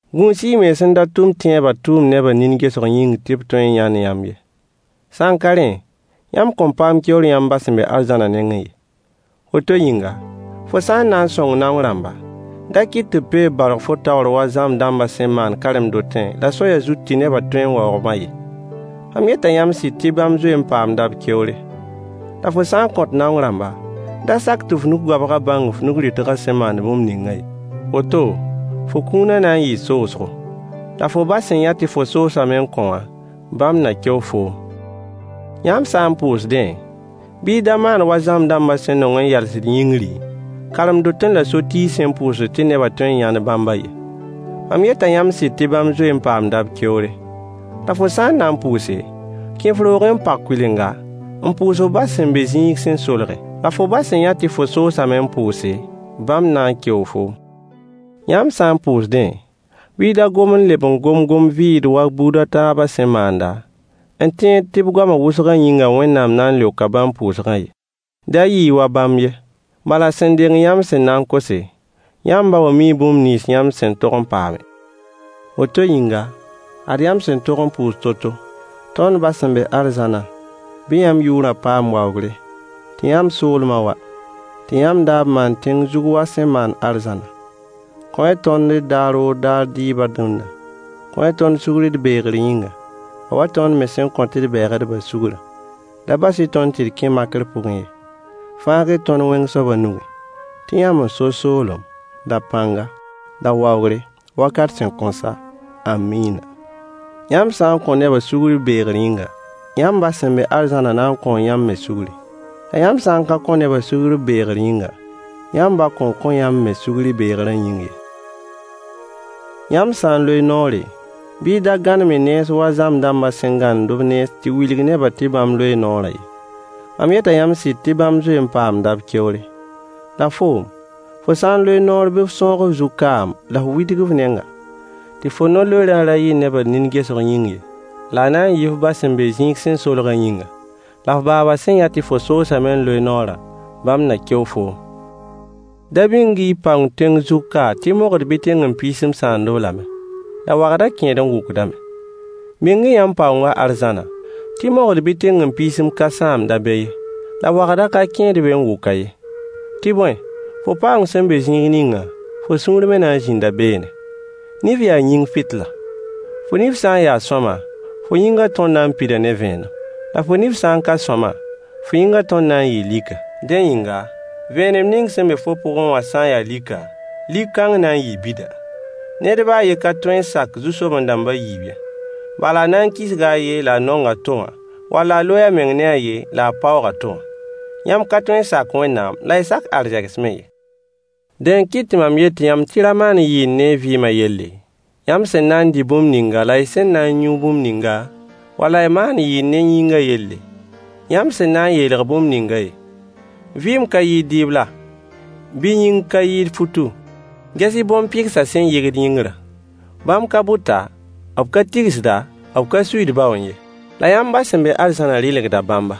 Gũus-y y mens n da tʋm tẽebã tʋʋm nebã nin gesg yĩng tɩ b tõe n yãnd yãmb ye. Sã n ka rẽ, yãmb kõn paam keoor yãmb ba sẽn be arzãnã nengẽ ye. Woto yĩnga, fo sã n na n sõng naong rãmba, da kɩt tɩ b peeb baorg fo taoor wa zãmb dãmbã sẽn maand karen-dotẽ la soayã zut tɩ nebã tõe n waoog-bã ye. Mam yeta yãmb sɩd tɩ bãmb zoe n paamda b keoore. La fo sã n kõt naong rãmba, da sak tɩ f nug-goabg bãng f nug-rɩtgã sẽn maand bũmb ningã ye. Woto, fo kũunã na n yɩɩ soosgo, la fo ba sẽn yã tɩ fo soosame n kõ wã, bãmb na keo foom. Yãmb sã n pʋʋsdẽ, bɩ y da maan wa zãmb dãmbã sẽn nong n yals yĩngri, karen-dotẽ la so-tiisẽ n pʋʋs tɩ nebã tõe n yãnd bãmbã ye. Mam yeta yãmb sɩd tɩ bãmb zoe n paamda b keoore. La fo sã n na n pʋʋse, kẽ f roogẽ n pag kʋɩlenga, n pʋʋs f ba sẽn be zĩig sẽn solge. La fo ba sẽn yã tɩ fo soosame n pʋʋse, bãmb na n keoo foom. Yãmb sã n pʋʋsdẽ, bɩ y da gom n leb n gom gom-vɩɩd wa buud a taabã sẽn maanda, n tẽed tɩ b goamã wʋsgã yĩnga Wẽnnaam na n leoka bãmb pʋʋsgã ye. Da yɩ-y wa bãmb ye, bala sẽn deng yãmb sẽn na n kose, yãmb ba wã mii bũmb nins yãmb sẽn tog n paame. Woto yĩnga, ad yãmb sẽn tog n pʋʋs to-to: Tõnd ba sẽn be arzãna, bɩ yãmb yʋʋrã paam waoogre, tɩ yãmb soolmã wa, tɩ yãmb daab maan tẽng zug wa a sẽn maand arzãnã. Kõ-y tõnd d daar o daar dɩɩbã dũnna. Kõ-y tõnd sugr d beegr yĩnga, a wa tõnd me sẽn kõt d bɛɛgdbã sugrã. Da bas-y tõnd tɩ d kẽ makr pʋgẽ ye. Fãag-y tõnd wẽng soabã nugẽ, [tɩ yãmb n so soolem la pãnga la waoogr wakat sẽn kõn sa. Ãmina!] Yãmb sã n kõ nebã sugr b beegr yĩnga, yãmb ba sẽn be arzãnã na n kõo yãmb me sugri. La yãmb sã n ka kõ nebã sugr b beegr yĩnga, yãmb ba kõn kõ yãmb me sugr y beegrã yĩng ye. Yãmb sã n loe noore, bɩ y da gãnem y nens wa zãmb dãmbã sẽn gãnemd b nens tɩ wilg nebã tɩ bãmb loee noorã ye. Mam yeta yãmb sɩd tɩ bãmb zoe n paamda b keoore. La foom, fo sã n loe noor bɩ f sõog f zug kaam la f widg f nenga, tɩ fo no-loeerã ra yɩ nebã nin gesg yĩng ye, la a na yɩ f ba sẽn be zĩig sẽn solgã yĩnga. La f baaba sẽn yã tɩ fo soosame n loe noorã, bãmb na keo foom. Da bĩng-y paoong tẽng zug ka tɩ mogd bɩ tẽng-n-piisim sãamd-b lame, la wagda kẽed n wʋkdame. Bĩng-y yãmb paoongã arzãna, tɩ mogd bɩ tẽngempiisim ka sãamd-a be ye, la wagda ka kẽed be n wʋk-a ye. Tɩ bõe, fo paoong sẽn be zĩig ningã, fo sũur me na n zĩnda beene. Nif yaa yĩng fɩtla. Fo nif sã n ya sõama, fo yĩngã tõr na n pida ne vẽenem. La fo nif sã n ka sõama, fo yĩngã tõr na n yɩɩ lika. Dẽ yĩnga, vẽenem ning sẽn be fo pʋgẽ wã sã n ya lika, lik-kãng na n yɩɩ bida. Ned ba a yen ka tõe n sak zu-soben-dãmb a yiib ye. Bala a na n kisga a yen la a nong a to wã, wala a loe a meng ne a yen la a paoog a to wã. Yãmb ka tõe n sak Wẽnnaam la y sak arzegs me ye. Dẽ n kɩt tɩ mam yet yãmb tɩ y ra maan yɩɩr ne y vɩɩmã yelle, yãmb sẽn na n dɩ bũmb ninga la y sẽn na n yũ bũmb ninga, wala y maan yɩɩr ne y yĩngã yelle, yãmb sẽn na n yeelg bũmb ningã ye. Vɩɩm ka yɩɩd dɩɩb la, bɩ yĩng ka yɩɩd futu? Ges-y bõn-pɩgsã sẽn yɩgd yĩngrã. Bãmb ka bʋta, b ka tigsda, b ka suiid baoẽ ye. La yãmb ba sẽn be arzãnã rɩlgda bãmba.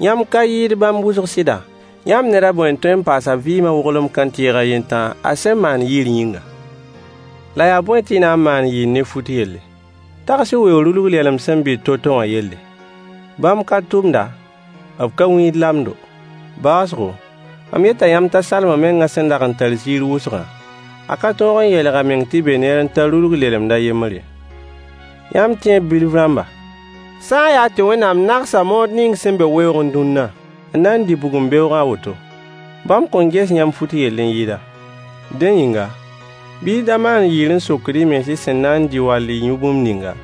Yãmb ka yɩɩd bãmb wʋsg sɩda? Yãmb ned a bõe n tõe n paas a vɩɩmã woglem kãntɩɩg a yen tãa a sẽn maand yɩɩr yĩnga? La yaa bõe tɩ y na n maan yɩɩr ne fut yelle? Tags-y weoog rulg-lɛlem sẽn bɩt to-to wã yelle. Bãmb ka tʋmda, b ka wĩid lamdo. Baoosgo, mam yeta yãmb t'a Salomo mengã sẽn dag n tar ziir wʋsgã, a ka tõog n yeelg a meng tɩ be neer n ta rulg lelemd a yembr ye. Yãmb tẽeb bilf rãmba! Sã n yaa tɩ Wẽnnaam nagsa mood ning sẽn be weoogẽ dũnna n na n dɩ bugum beoogã a woto, bãmb kõn ges yãmb fut yell n yɩɩda? Dẽ yĩnga, bɩ y da maan yɩɩr n sokd y mens y sẽn na n dɩ wall y yũ bũmb ninga,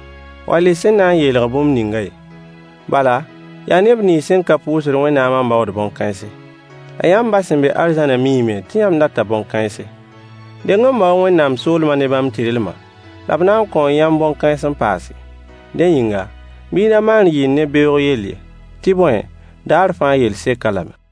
wall y sẽn na n yeelg bũmb ninga ye. Bala yaa neb nins sẽn ka pʋʋsd Wẽnnaamã n baood bõn-kãense. La yãmb ba sẽn be arzãnã miime tɩ yãmb data bõn-kãense. Deng n bao-y Wẽnnaam soolmã ne bãmb tɩrlmã, la b na n kõo yãmb bõn-kãens n paase. Dẽ yĩnga, bɩ y da maan yɩɩr ne beoog yell ye, tɩ bõe, daar fãa yell sek-a lame.